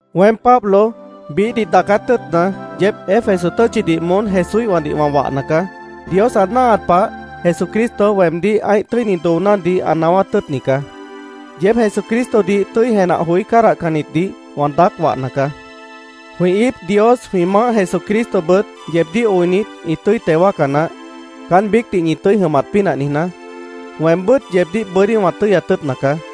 Weém, Pablo, biíhdih daacát tʉ́ʉtna, yeéb Éfeso tʉ́tchidih moón Jesúíhwãdih wã wahna caá. Dios ã náahat pah Jesucristo weemdíh ã́ih tʉ́ini doonádih ã naáwát tʉ́ʉtni caá. Yeéb Jesucristodih tʉ́i jenah joí cádahcannitdih wã daác wahna caá. Jwĩ íip Dios, jwĩ Maáh Jesucristobʉt, yeebdíh oinit, ĩ tʉ́i teo wáaca naáh, caán biícdih ñi tʉ́i jʉmat pínah niijná. Weembʉ́t yeebdíh bʉ́dí wã tʉ́yat tʉ́ʉtna caá.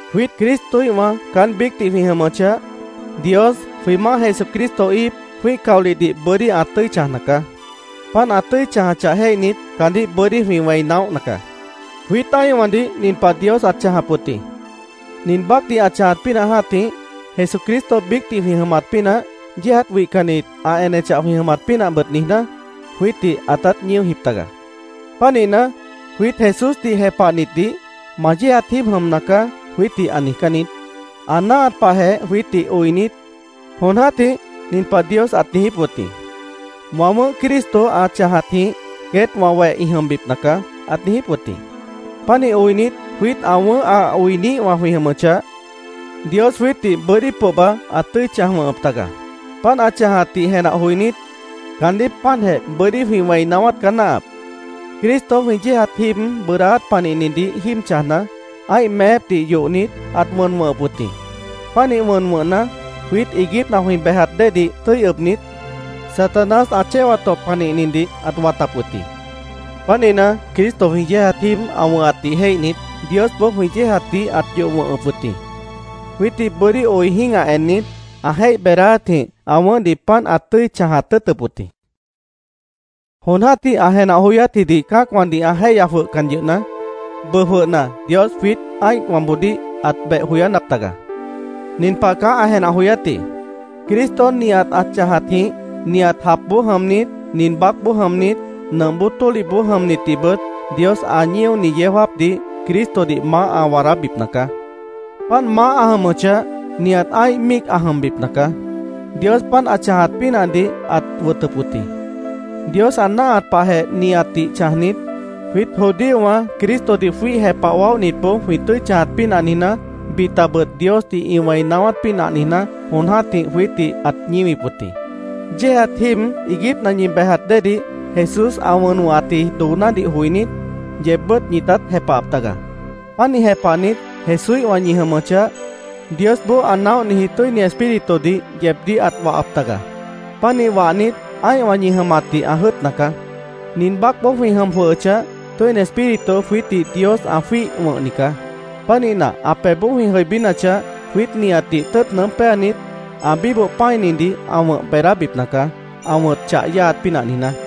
Jwiít Cristoíhwã caán biícdih jwĩ jʉmʉchah, Dios, jwĩ Maáh Jesucristo íip, jwĩ́ih caolihdih bʉ́dí ã tʉ́i chãjna caá. Páant ã tʉ́i chãjachah jéihnit, caandíh bʉ́dí jwĩ wẽi naóhna caá. Jwiít ã́ihwãdih nin pah Dios ãt chãjap wʉt jĩ. Nin baácdih ã chãjat pínah jã́tih, Jesucristo biícdih jwĩ jʉmat pínah, yéejat wihcannit ã enechah jwĩ jʉmat pínahbʉt niijná, jwiítdih ãtát ñíojip taga. Pánihna, jwiít Jesúsdih jepahnitdih, “Ma yéejat jíib jʉmna caá”, jwiítdih ã niijcán niít. Ã náahat pahjeh jwiítdih oinit, jon jã́tih nin pah Dios ãt niijíp wʉt jĩ: “Wã wʉ̃ʉ́h Cristo ã chãjatjĩh queét wã weh ĩ jʉmbipna caá”, ãt niijíp wʉt jĩ. Pánih oinit, jwiít ã wʉ̃ʉ́h ã oiniíhwã jwĩ jʉmʉchah, Dios jwiítdih bʉ́dí pohba ãt tʉ́i chãj wʉ̃hʉp taga. Páant ã chãjatdih jenah joinít, caandíh páantjeh bʉ́dí jwĩ wẽi naáwát caá náahap. Cristo jwĩ yéejat jíib bʉʉdáát panihnidih jíib chãjna, ã́ih meépdih yohnit, ãt wʉn wʉ̃hʉp wʉt jĩ. Pánih wʉn wʉ̃hna, jwiít iiguípna jwĩ bejat déedih tʉ́i ʉbnit, Satanás ã chéwat tõp panihnidih ãt watap wʉt jĩ. Pánihna, Cristo jwĩ yéejat jíib ã wʉ̃hatdih jéihnit, Diosboó jwĩ yéejatdih ãt yoh wʉ̃hʉp wʉt jĩ. Jwiítdih bʉ́dí oi jĩ́gah ennit, ã jéih beedáátjĩh ã wʉ̃ʉ́hdih páant ãt tʉ́i chãjat tʉ́ʉtʉp wʉt jĩ. Jon jã́tih ã jenah joyátjidih cã́acwãdih ã jéihya jwʉhcan yʉhna, bʉʉ jwʉhna Dios jwiít ã́ihwãboodíh ãt beh joyánap taga. Nin pah caá ã jenah joyátji: Cristo nihat ã chãjatjĩh, nihat japboó jʉmnit, nin baácboó jʉmnit, nʉmp bóo tólihboó jʉmnitdihbʉt Dios ã ñíoni yeó jáapdih Cristodih maáh ã waadábipna caá. Páant maáh ã jʉmʉchah, nihat ã́ih míic ã jʉmbipna caá. Dios páant ã chãjat pínahdih ãt wʉtʉp wʉt jĩ. Dios ã náahat pahjeh nihatdih chãjnit, jwiít judíowã Cristodih jwíih jepah waóhnitboó jwĩ tʉ́i chãjat pínah niijná, bitabʉt Diosdih ĩ wẽi naáwát pínah niijná, jon jã́tih jwiítdih ãt ñíwip wʉt jĩ. Yéejat jíib iiguípna ñi bejat déedih Jesús ã wʉn wʉ̃hatji doonádih joinít, yeebbʉ́t ñitát jepahap taga. Pánih jepahnit, Jesúíhwã ñi jʉmʉchah, Diosboó ã naóhniji Tʉ́ini Espíritudih yeebdíh ãt wahap taga. Pánih wahnit, ã́ihwã ñi jʉmatdih ã jʉ́ʉtna caá. Nin baácboó jwĩ jʉm jwʉhʉchah, Tʉ́ini Espíritu jwiítdih Dios ã jwíih wʉ̃hni caá. Pánihna, ã pebhboó jwĩ jʉibínachah, jwiít nihatdih tʉ́ʉt nʉʉ́m péanit, ã bíboh pã́inidih ã wʉ̃h beedábipna caá, ã wʉ̃t chah yáaat pínah niijná.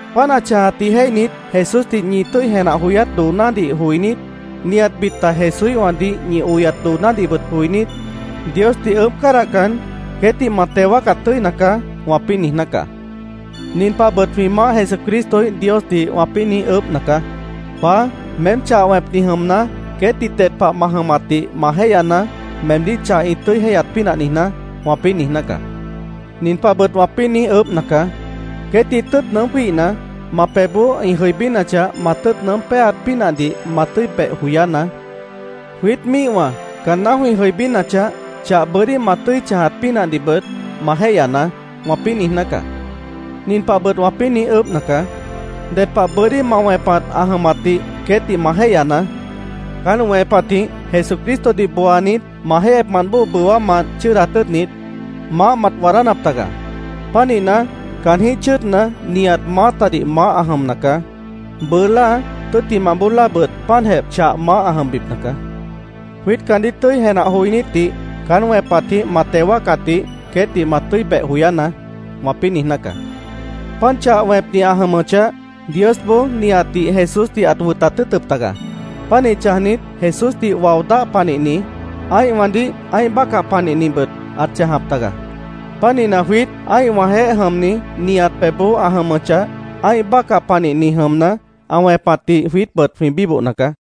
Páant ã chãjatdih jéihnit, Jesúsdih ñi tʉ́i jenah joyát doonádih joinít, nihat bita Jesúíhwãdih ñi oyat doonádihbʉt joinít, Diosdih ʉʉ́bh cádahcan, “Queétdih ma teo wáacat tʉ́ina caá”, wãpĩ́ niijná caá. Nin pahbʉt jwĩ Maáh Jesucristoíh Diosdih wãpĩ́ niíj ʉʉ́bhna caá: “Paá, meém chah wẽpni jʉmna, queétdih ded pah ma jʉmatdih ma jéihyanaá, meemdíh chah ĩ tʉ́i jéihyat pínah niijná”, wãpĩ́ niijná caá. Nin pahbʉt wãpĩ́ niíj ʉʉ́bhna caá: “Queétdih tʉ́ʉt nʉʉ́m jwíihna, ma pebhboó ĩ jʉibínachah, ma tʉ́ʉt nʉʉ́m péaat pínahdih ma tʉ́i beh joyánaá. Jwiít míihwã caanná jwĩ jʉibínachah, chah bʉ́dí ma tʉ́i chãjat pínahdihbʉt, ma jéihyanaá”, wãpĩ́ niijná caá. Nin pahbʉt wãpĩ́ niíj ʉʉ́bhna caá: “Ded pah bʉ́dí ma wẽpat ã jʉmatdih queétdih ma jéihyanaá. Caán wẽpatjĩh Jesucristodih booanit, ma jéihyepmant bóo bʉwámant chʉ́ʉdat tʉ́ʉtnit, maáh mat waadánap taga. Pánihna, caanjĩ́h chʉ́ʉdna, nihat maátadih maáh ã jʉmna caá. Bʉʉ láa, tʉ́ttimah bóo láabʉt páantjeh chah maáh ã jʉmbipna caá. Jwiít caandíh tʉ́i jenah joinítdih caán wẽpatjĩh ma teo wáacatdih queétdih ma tʉ́i beh joyánaá”, wãpĩ́ niijná caá. Páant chah wẽpni ã jʉmʉchah, Diosboó nihatdih Jesúsdih ãt wʉtat tʉ́ʉtʉp taga. Pánih chãjnit, Jesúsdih wao dáh panihni, ã́ihwãdih ã́ih bácah panihnibʉt ãt chãjap taga. Pánihna, jwiít ã́ihwãjeéh jʉmni nihat pebhboó ã jʉmʉchah, ã́ih bácah panihni jʉmna, ã wẽpatdih jwiítbʉt jwĩ bíbohna caá.